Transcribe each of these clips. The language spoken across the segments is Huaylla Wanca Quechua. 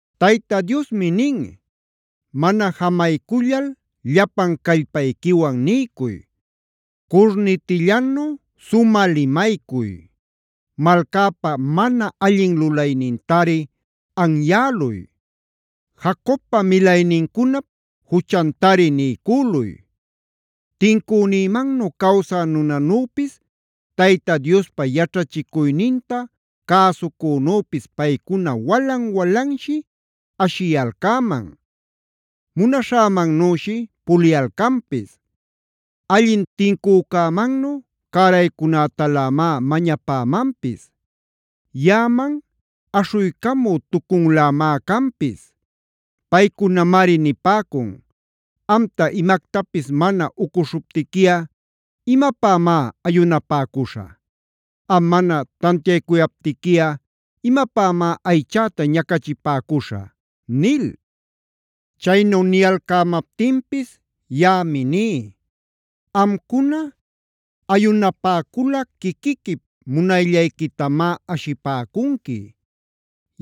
Tayta Diosmi nin: “Mana jamaycullal llapan callpayquiwan niycuy. Curnitillanu sumä limaycuy. Malcäpa mana allin lulaynintari anyäluy; Jacobpa milaynincunap juchantari niycüluy. Tincünïmannu cawsä nunanüpis, Tayta Diospa yaćhachicuyninta cäsucünüpis paycuna walan-walanshi ashiyalcäman; munaśhämannüshi puliyalcanpis. Allin tincücämannu cäraycunätalämá mañapämanpis; yaꞌaman aśhuycamü-tucunlämá canpis. Paycunamari nipäcun: ‘Amta imactapis mana ucuśhuptiquiꞌa ¿imapämá ayunapäcuśhä? Am mana tantiaycuyaptiquiꞌa ¿imapämá aychäta ñacachipäcuśhä?’ nil. “Chaynu niyalcämaptinpis yaꞌami ní: Amcuna ayunapäculꞌa quiquiquip munayllayquitamá ashipäcunqui;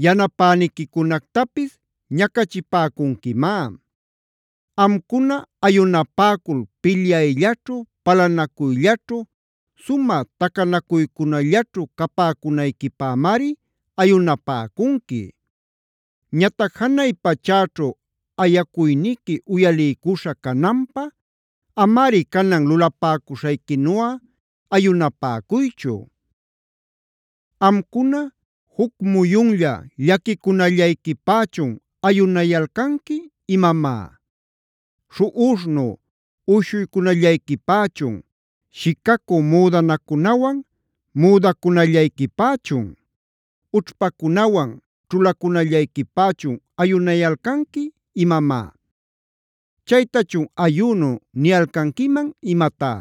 yanapäniquicunactapis ñacachipäcunquimá. Amcuna ayunapäcul pilyayllaćhu, palanacuyllaćhu, sumä tacanacuycunallaćhu capäcunayquipämari ayunapäcunqui. Ñatac janay pachäćhu ayacuyniqui uyaliycuśha cananpä, amari canan lulapäcuśhayquinuꞌa ayunapäcuychu. Amcuna ¿juc muyunlla llaquicunallayquipächun ayunayalcanqui imamá? ¿Śhuꞌuśhnu uyshuycunallayquipächun, shicacü müdanacunawan müdacunallayquipächun, ućhpacunawan ćhulacunallayquipächun ayunayalcanqui imamá? Chaytachun ¿ayünu niyalcanquiman imatá?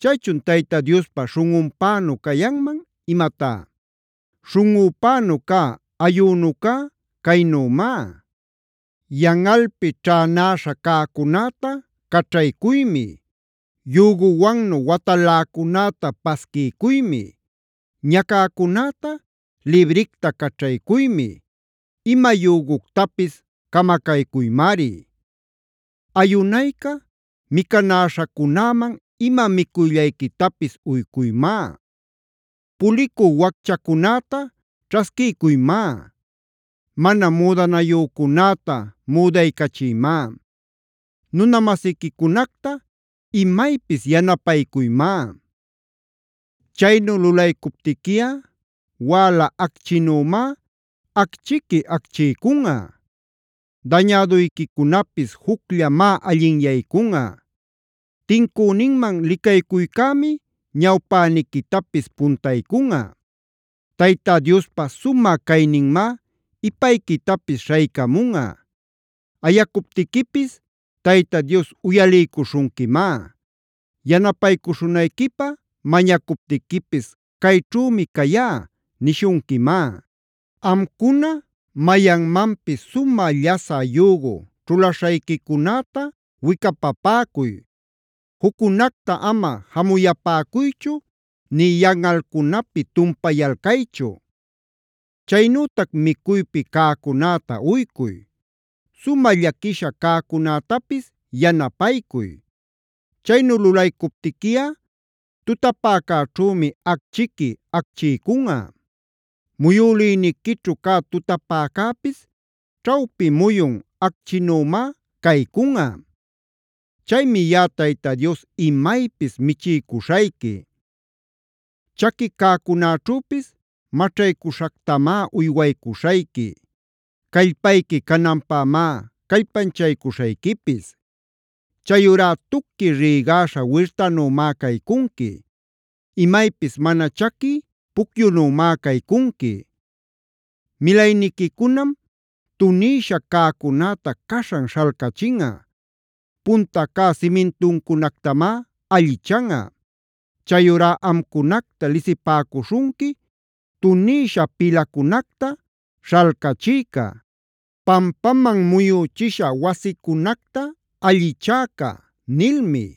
¿Chaychun Tayta Diospa śhunꞌunpänu cayanman imatá? “Śhunꞌüpänu cä ayünucá caynümá: Yanꞌalpi ćhänäśha cäcunäta caćhaycuymi; yüguwannu wataläcunäta pasquiycuymi; ñacäcunäta libricta caćhaycuymi; ima yüguctapis camacaycuymari. Ayunayca, micanäśhacunäman ima micuyllayquitapis uycuymá; pulicü wacchacunäta ćhasquiycuymá; mana müdanayücunäta müdaycachiymá; nuna-masiquicunacta imaypis yanapaycuymá. “Chaynu lulaycuptiquiꞌa wäla acchïnümá acchiqui acchiycunꞌa; dañäduyquicunapis jucllamá allinyaycunꞌa; tincüninman licaycuycämi ñawpäniquitapis puntaycunꞌa; Tayta Diospa sumä cayninmá ipayquitapis śhaycamunꞌa. Ayacuptiquipis Tayta Dios uyaliycuśhunquimá. Yanapaycuśhunayquipä mañacuptiquipis ‘cayćhümi cayá’ nishunquimá. “Amcuna mayanmanpis sumä llasä yügu ćhulaśhayquicunäta wicapapäcuy; juccunacta ama jamuyapäcuychu nï yanꞌalcunapi tumpayalcaychu. Chaynütac micuypi cäcunäta uycuy; sumä llaquiśha cäcunätapis yanapaycuy. Chaynu lulaycuptiquiꞌa tutapäcäćhümi acchiqui acchiycunꞌa; muyülïniquićhu cä tutapäcäpis ćhawpi muyun acchinümá caycunꞌa. Chaymi yaꞌa Tayta Dios imaypis michiycuśhayqui; chaqui cäcunäćhüpis maćhaycüśhactamá uywaycuśhayqui; callpayqui cananpämá callpanchaycuśhayquipis. Chayurá tuqui rïgaśha wirtanümá caycunqui; imaypis mana chaqui pucyunümá caycunqui. Milayniquicunam tunïsha cäcunäta caśhan śhalcachinꞌa; punta cä simintuncunactamá allichanꞌa. Chayurá amcunacta lisipäcuśhunqui: ‘Tunïshaa pilacunacta śhalcachïca. Pampaman muyüchisha wasicunacta allichäca’ nilmi.